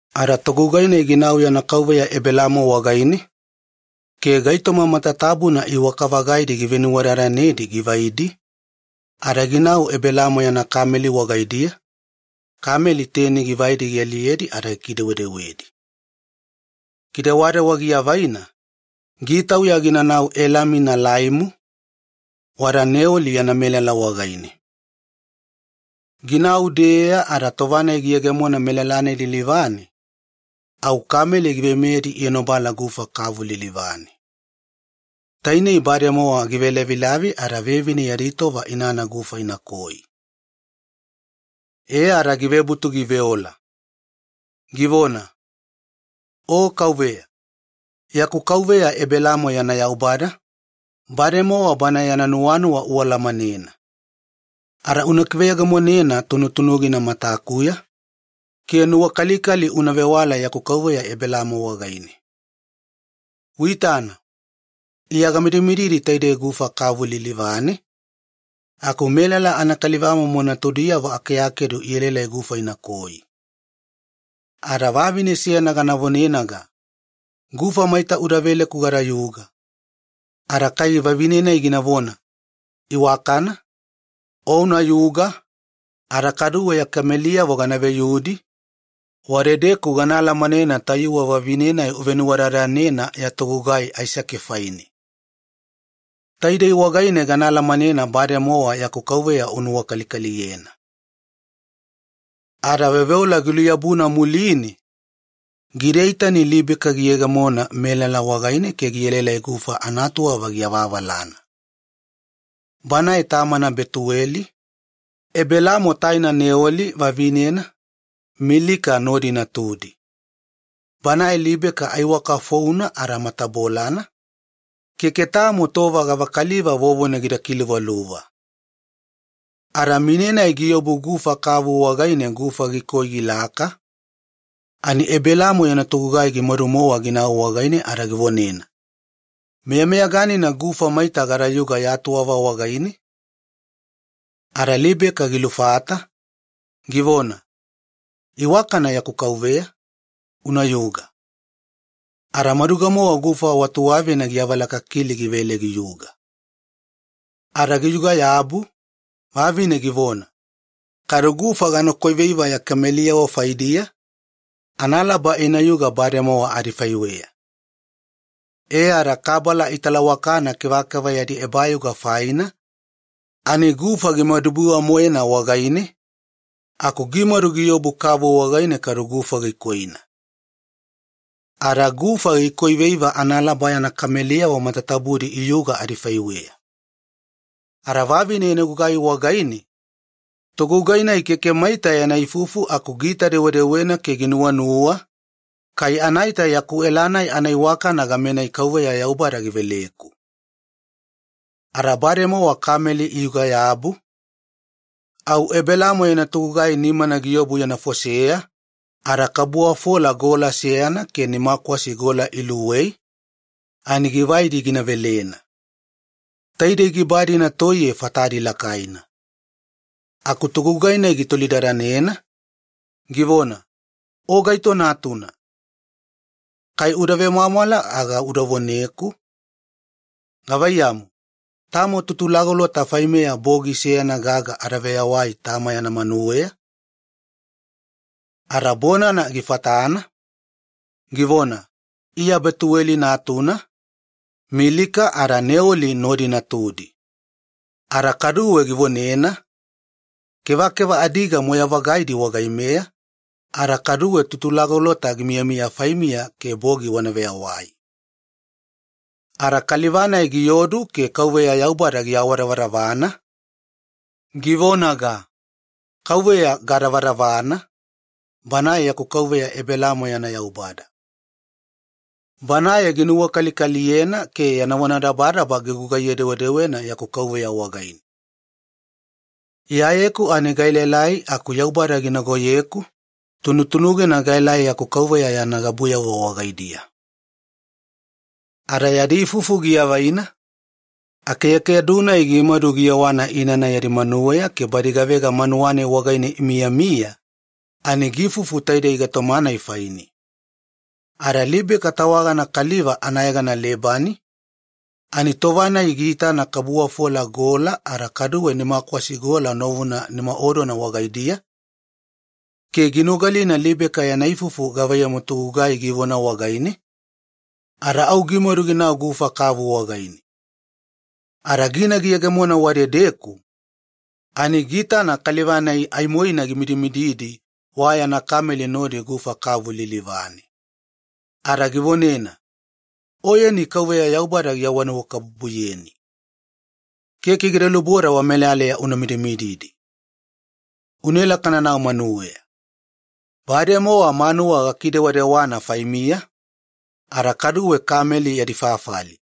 Ada togugai-nai ginau yana kauveya Ebelaamo wagaine ke gaitoma matatabuna iwaka-vagaidi givenuwadadanedi givaidi, ada ginau Ebelaamo yana kameli wagaidiya, kameli teni givaidi gialiyedi ada gikidewedewedi. Kidewadewa giavaina, gitauya ginanau Elami Naalaimu, wada Neoli yana melala wagaine. Ginau-deeeya ada tova-nai giyegemona melala-nai lilivane au kameli giveimeyedi ienobala gufa kavu lilivane. Tainei bademowa givelavilavi ada vevine yadi tova inana gufa inakoi. E ada givebutu giveola, givona, “O Yaubada, yaku kauveya Ebelaamo yana Yaubada, bademowa bana yana nuwanuwa ualamanena. Ada meyameyaganina uda kiveyegemonena tunutunugina matakuya, ke nuwakalikali una vewala yaku kauveya Ebelaamo wagaine. Uitana iya gamidimididi taidei gufa kavu lilivane, aku melala anakalivamomo natudiyavo akeakedu ielaelai gufa inakoi. Ada vavine seyana gana vonenaga, 'Gufa maita uda veleku gadayuga,' ada kai vavine gina vona, ‘Iwakana, unayuga ada kaduwe ya kameliyavo gana veyudi,’ wadedeku gana alamanena tayuwe vavine-nai uvenuwadadanena ya togugai Aisake faine. E ada taidei wagaine gana alamanena bademowa nuwakalikali uvewala yaku kauveya wagaine.” Ada veoveola giluyabuna muline gidaita-ni Libeka giyegemona melala wagaine ke gielaelai gufa anatuwava giavaavalana. Banae tamana Betuweli, Ebelaamo taina Neoli vavinena Milika nodi natudi. Banae Libeka aiwaka founa ada matabolana, keke tamo tova gavakaliva vovona gida kiluvaluva. Ani mine-nai giobu gufa kavu wagaine gufa gikoi gilaka, ani Ebelaamo yana togugai gimaduga-mowa ginau wagaine ada givonena, “Meyameyaganina gufa maita gadayuga ya tuwava wagaine?” Ada Libeka gilufata, givona, “Iwakana yaku kauveya, unayuga,” ke maduga-mowa gufa watuwavina giavalakakili givele giyuga. Ada giyuga-yabu, vavine givona, “Kadu gufa ganakoi veiva ya kameliyavo faidiya, analaba inayuga bademowa adifaiweya.” E ada gufa gimadubiwa-moena kabala italawakana kevakeva yadi ebayuga faina ani wagaine aku gimadu giobu kavu wagaine kadu gufa gikoina, ada gufa gikoi veiva analaba yana kameliyavo matatabudi iyuga adifaiweya. Ada vavine yana gugai wagaine togugai-nai keke maita yana ifufu, aku aimo giitavenuvenuwadadanena ke ginuwanuwa, ‘Kai anaita yaku ela-nai anaiwakana gamenai Yaubada giveleku.’ Ada bademowa kameli iyuga-yabu, au Ebelaamo yana togugai nimana giobu yana foseya ada kabuwafola gola seyana ke nimakwasi gola luwei ani givaidi gina velena. Taidei giba-dina toiye fatadi lakaina. Aku togugai-nai gitolidadanena, givona, “O gaito natuna? Kai uda vemwamwala aga uda voneku, gavaiyamu, tamo tutulagolota faimeya bogi seyana gaga adaveyawai tama yana manuweya?” Ada bonana gifatana, givona, “Iya Betuweli natuna, Milika ada Neoli nodi natudi.” Ada kaduwe givonena, “Kevakeva adiga moyai-vagaina wagaimeya, anafaiweya tutulagolota gimiyamiya faimiya ke bogi wana veyawai.” Ada kaliva-nai giodu ke Yaubada giawadavadavana. Ada givonaga, “Yaubada gadavadavana, yaku kauveya Ebelaamo yana Yaubada. Banae ginuwakalikaliyena ke yana vonadabadaba gigugaiye-dewedewena yaku kauveya wagaine. Anafaiweya iya gaelaelai aku Yaubada ginagoyeku tunutunugina gaelai yaku kauveya yana gabuyavo wagaidiya.” Ada yadi ifufu giavaina, akeakedu-nai gimadu giyewana inana yadi manuweya ke badi gavega manuwa-nai wagaine imiyamiya ani giifufu taidei gaitoma-nai faine. Ada Libeka tawagana kaliva anayegana Lebani, ani tova-nai giitana kabuwafola gola ada kaduwe nimakwasi gola novuna nimaodona wagaidiya, ke ginogalina Libeka yana ifufu gavaiyamu togugai givona wagaine, ada au gimadu ginau gufa kavu wagaine. Ada gina giyegemona wadedeku ani giitana kaliva-nai aimoina gimidimididi wayana kameli nodi gufa kavu lilivane. Ada givonena, “Oyeni Yaubada givonanuwakabubuyeni, ada keke gida luboda idedeku una midimididi. Unaela kananau manuweya. Manuwa bademowa gakidewadewana fainiya ada kaduwe kameli yadi fafali.”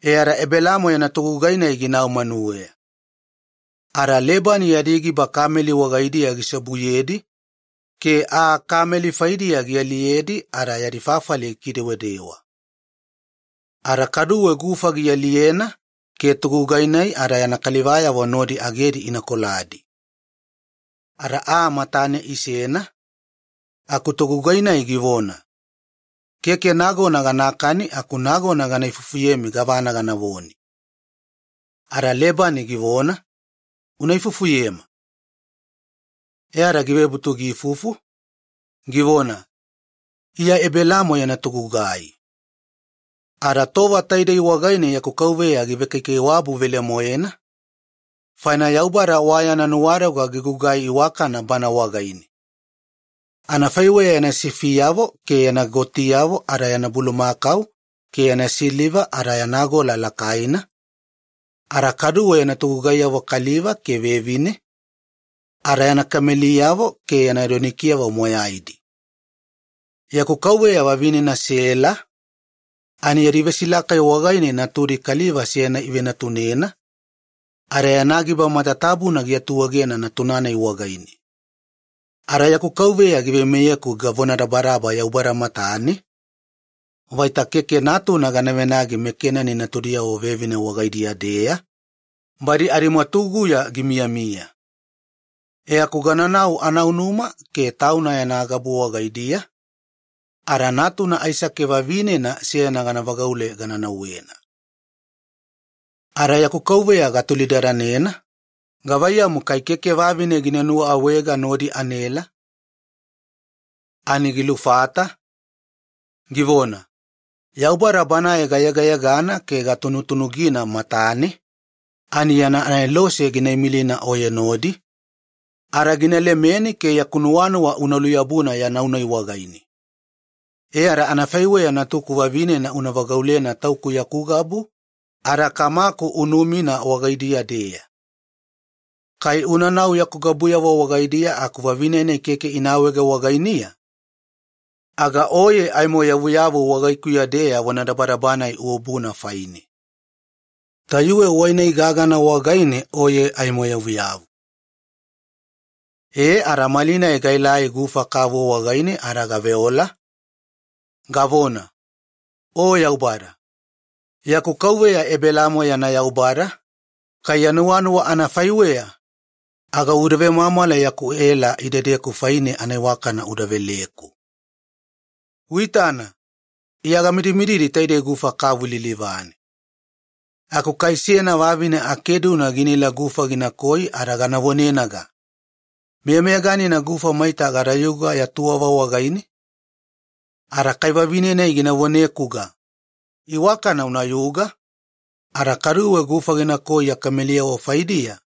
E ada Ebelaamo yana togugai-nai ginau manuweya. Ada Lebani yadi giba kameli wagaidiya giseobuyedi ke aa kameli faidiya gialiyedi ada yadi fafali gikidewadewa. Ada kaduwe gufa gialiyena ke banae ada yana kalivayavo nodi agedi ina koladi. Ada aa matane isena, aku togugai-nai givona, “Keke nagona gana madukani, analaba gana ifufuyemi gavana ganavone.” Ada Lebani givona, “Una ifufuyema.” E ada givebutu ifufu, givona, “Iya Ebelaamo yana togugai. Ada tova taidei wagaine yaku kauveya givekaikaiwabu velemoena, faina Yaubada gilemena lakai-vagaina gaitoma moyaina wagaidiya. Anafaiweya yana sifiyavo ke yana gotiyavo ada yana bulumakau ke yana siliva ada yana gola lakaina, ada kaduwe yana togugaiyavo kaliva ke vevine ada yana kameliyavo ke yana donikiyavo moyaidi. Yaku kauveya vavinena Sela yadi vesilakai wagaine natudi kaliva seyana ivenatunena, ada yana giba matatabuna giatuegena wagaine. Ada yaku kauveya giveimeyeku gavonadabadaba Yaubada matane vaita keke natuna gana venagi meKenani natudiyavo vevine wagaidiya-deya, badi adimwatuguya gimiyamiya. E aku gananau anaunuma ke tauna yana gabu wagaidiya ada natuna Aisake vavinena seyana gana vagaule gana nauwena. “Ada yaku kauveya gatolidadanena, 'Gavaiyamu kai keke vavine gina nuwa awaega nodi anaela?' “Ani gilufata, givona, 'Yaubada Banae gayegayegana ke gatunutunugina matane, ani aimo yana anelose gina imilina oye nodi ke gina lemeni yaku nuwanuwa una luyabuna ya nau-nai wagaine. E ada afaiweya natuku vavinena una vagaulena tauku yaku gabu ada kamaku unumina wagaidiya-deya. Kai unanau yaku gabuyavo wagaidiya aku vavine-nai keke ina awaege wagainiya, aga oye aimo yavuyavu wagaikuya-deya vonadabadaba-nai ububuna faine. Tayuwe wai-nai wagaine gagana oye aimo yavuyavu.' “E, ada malinai gaelai gufa kavu wagaine ada gaveola, gavona, 'O Yaubada, yaku kauveya Ebelaamo yana Yaubada, kai ya nuwanuwa anafaiweya aga uda vemwamwala yaku ela idedeku faine anaiwakana uda veleku. Uitana, iya gamidimididi taidei gufa kavu lilivane. Aku kai seyana vavine akeduna ginaela gufa ginakoi ada gana vonenaga, “Meyameyaganina ya tuwaveya maita gufa gadayuga?” ada kai vavine-nai gina vonekuga, “Iwakana unayuga, ada kaduwe gufa ganakoi ya kameliyavo faidiya,”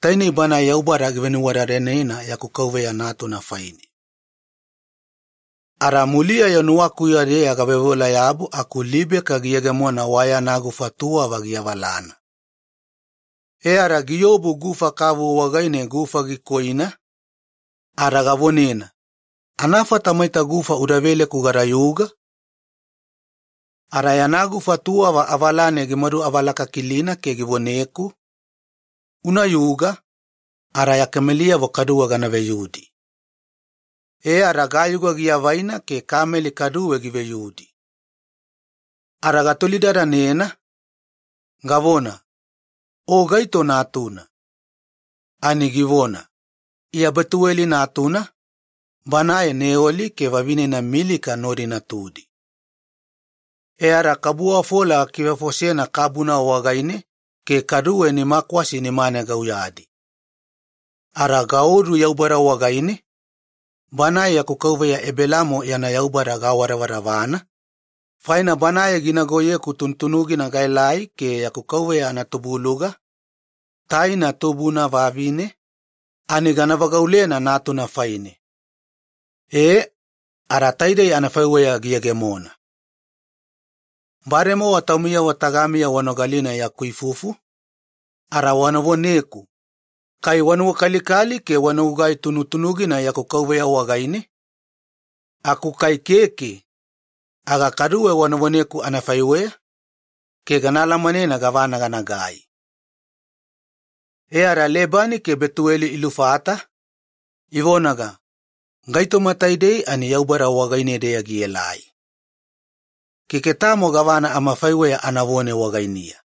tainei banae Yaubada givenuwadadanena yaku kauveya natuna faine. “Ada muliya-yo nuwakuya-deya gaveoveola-yabu aku Libeka giyegemona wayana gufa tuwava giavaavalana e ada giobu gufa kavu wagaine gufa gikoina, ada gavonena, ‘Meyameyaganina maita gufa uda veleku gadayuga?’ “Ada yana gufa tuwava avalane gimaduavalakakilina ke givoneku, ‘Unayuga, ada ya kameliyavo kaduwe gana veyudi.’ E ada gayuga giavaina ke kameli kaduwe giveyudi. “Ada gatolidadanena, gavona, 'O gaito natuna?' “Ani givona, 'Iya Betuweli natuna, banae Neoli ke vavinena Milika nodi natudi.' E ada kabuwafola gakivefosena kabuna wagaine ke kaduwe nimakwasi nimane gauyadi, ada gaodu Yaubada wagaine gavona vesiule. Ada yaku kauveya Ebelaamo yana Yaubada gaawadavadavana, faina Banae ginagoyeku tunutunugina gaelai ke yaku kauveya anatubuluga, taina tubuna vavine ani gana vagaulena natuna faine. E, ada taidei anafaiweya giyegemona. “Bademowa taumiyavo tagamiya wanogalina yaku ifufu, ada wana voneku, kai wanuwakalikali ke wanagugai tunutunugina yaku kauveya wagaine? Aku kai keke aga kaduwe wana voneku anafaiweya, ke gana alamanena gavana ganagai.” E ada Lebani ke Betuweli ilufata, ivonaga, “Gaitoma taidei Yaubada wagaine-deya gielai, ada keke tamo gavana amafaiweya anavone wagainiya.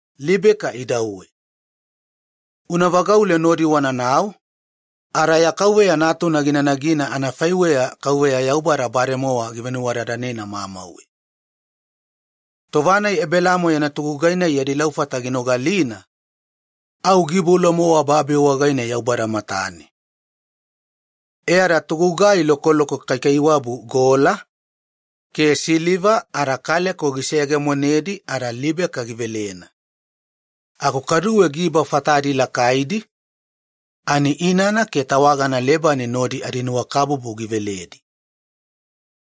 Libeka idauwe, una vagaule nodi wananau ada ya kauveya natuna gina nagina anafaiweya Yaubada bademowa givenuwadadanena mamauwe.” Tova-nai Ebelaamo yana togugai-nai yadi laufata ginogalina, au giiboula-mowa babi wagaine Yaubada matane. E ada togugai lokoloko kaikaiwabu gola ke siliva giseyegemonedi ada Libeka givelena, aku kaduwe giba fatadi lakaidi ani inana ke tawagana Lebani nodi adinuwakabubu giveledi.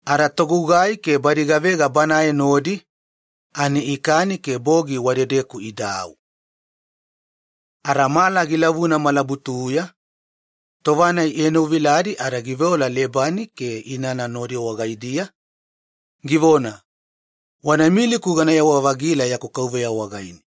Ada togugai ke badi gavega banae nodi ani ikani ke bogi wadedeku idau. Ada mala gilavuna malabutuya tova-nai ienoviladi ada giveola Lebani ke inana nodi wagaidiya, givona, “Wanaimiliku ganayewa-vagila yaku kauveya wagaine.”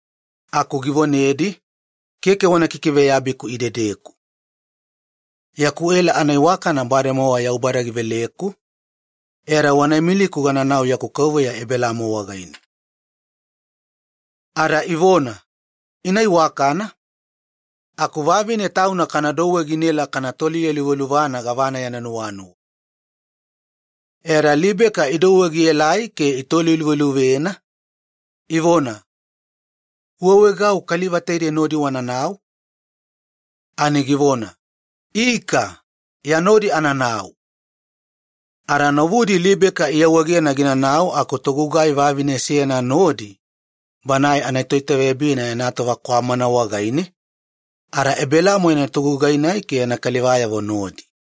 Aku givonedi, “Keke wana kikiveyabiku idedeku. Yaku ela anaiwakana bademowa Yaubada giveleku, e ada wanamadu awaegeku gananau yaku kauveya Ebelaamo wagaine.” Ada ivona, “Ina iwakana, aku vavine tauna kanadouwe ginaela kana toliyeluvaluvana gavana yana nuwanuwa.” E ada Libeka idouwe gielai ke itoliluveluvena, ivona, “Uawaegau kaliva taidei nodi wananau?” Ani givona, “Ika, iya nodi ananau.” Ada novudi Libeka iawaegena ginanau aku togugai vavine seyana nodi banae anatoitaveyabina yana tova kwamana wagaine, ada Ebelaamo yana togugai-nai ke yana kalivayavo nodi.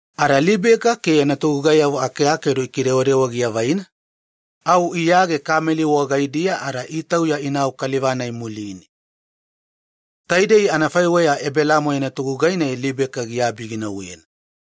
Ada Libeka ke yana togugaiyavo akeakedu ikidewadewa giavaina au iyage kameli wagaidiya ada matatabudi itauya kaliva-nai nodi. Taidei anafaiweya Ebelaamo yana togugai-nai Libeka giabi ginauwena.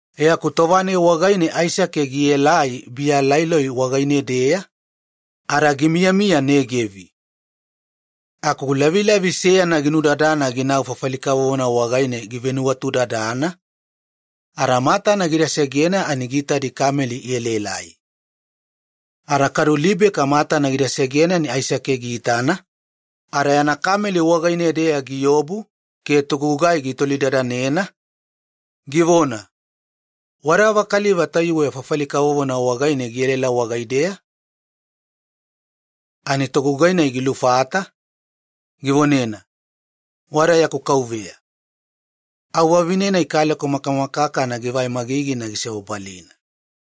E aku tova-nai wagaine Aisake gielai Biya Laai Loi wagaine-deya ada gimiyamiya Negevi. Aku lavilavi seyana ginudadana ginau fafali kavovona wagaine givenuwatudadana, ada matana gida segena ani giitadi kameli ielaelai. Ada kadu Libeka matana gida segena ani Aisake giitana, ada yana kameli wagaine-deya giobu ke togugai gitolidadanena, givona, “Wada gava kaliva tayuwe fafali kavovona wagaine gielaela wagaideya?” Ani togugai-nai gilufata, givonena, “Wada yaku kauveya.” Au vavine kaleko makamakakana givai magigina gisebabalina.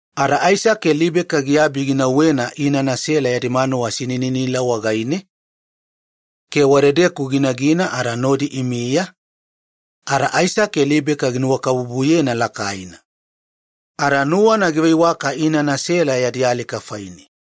Ada Aisake Libeka giabi ginauwena inana Sela yadi manuwa sinininila wagaine ke wadedeku ginagina ada nodi imiya, ada Aisake Libeka ginuwakabubuyena lakaina. Ada nuwana giveiwaka inana Sela yadi alika faine.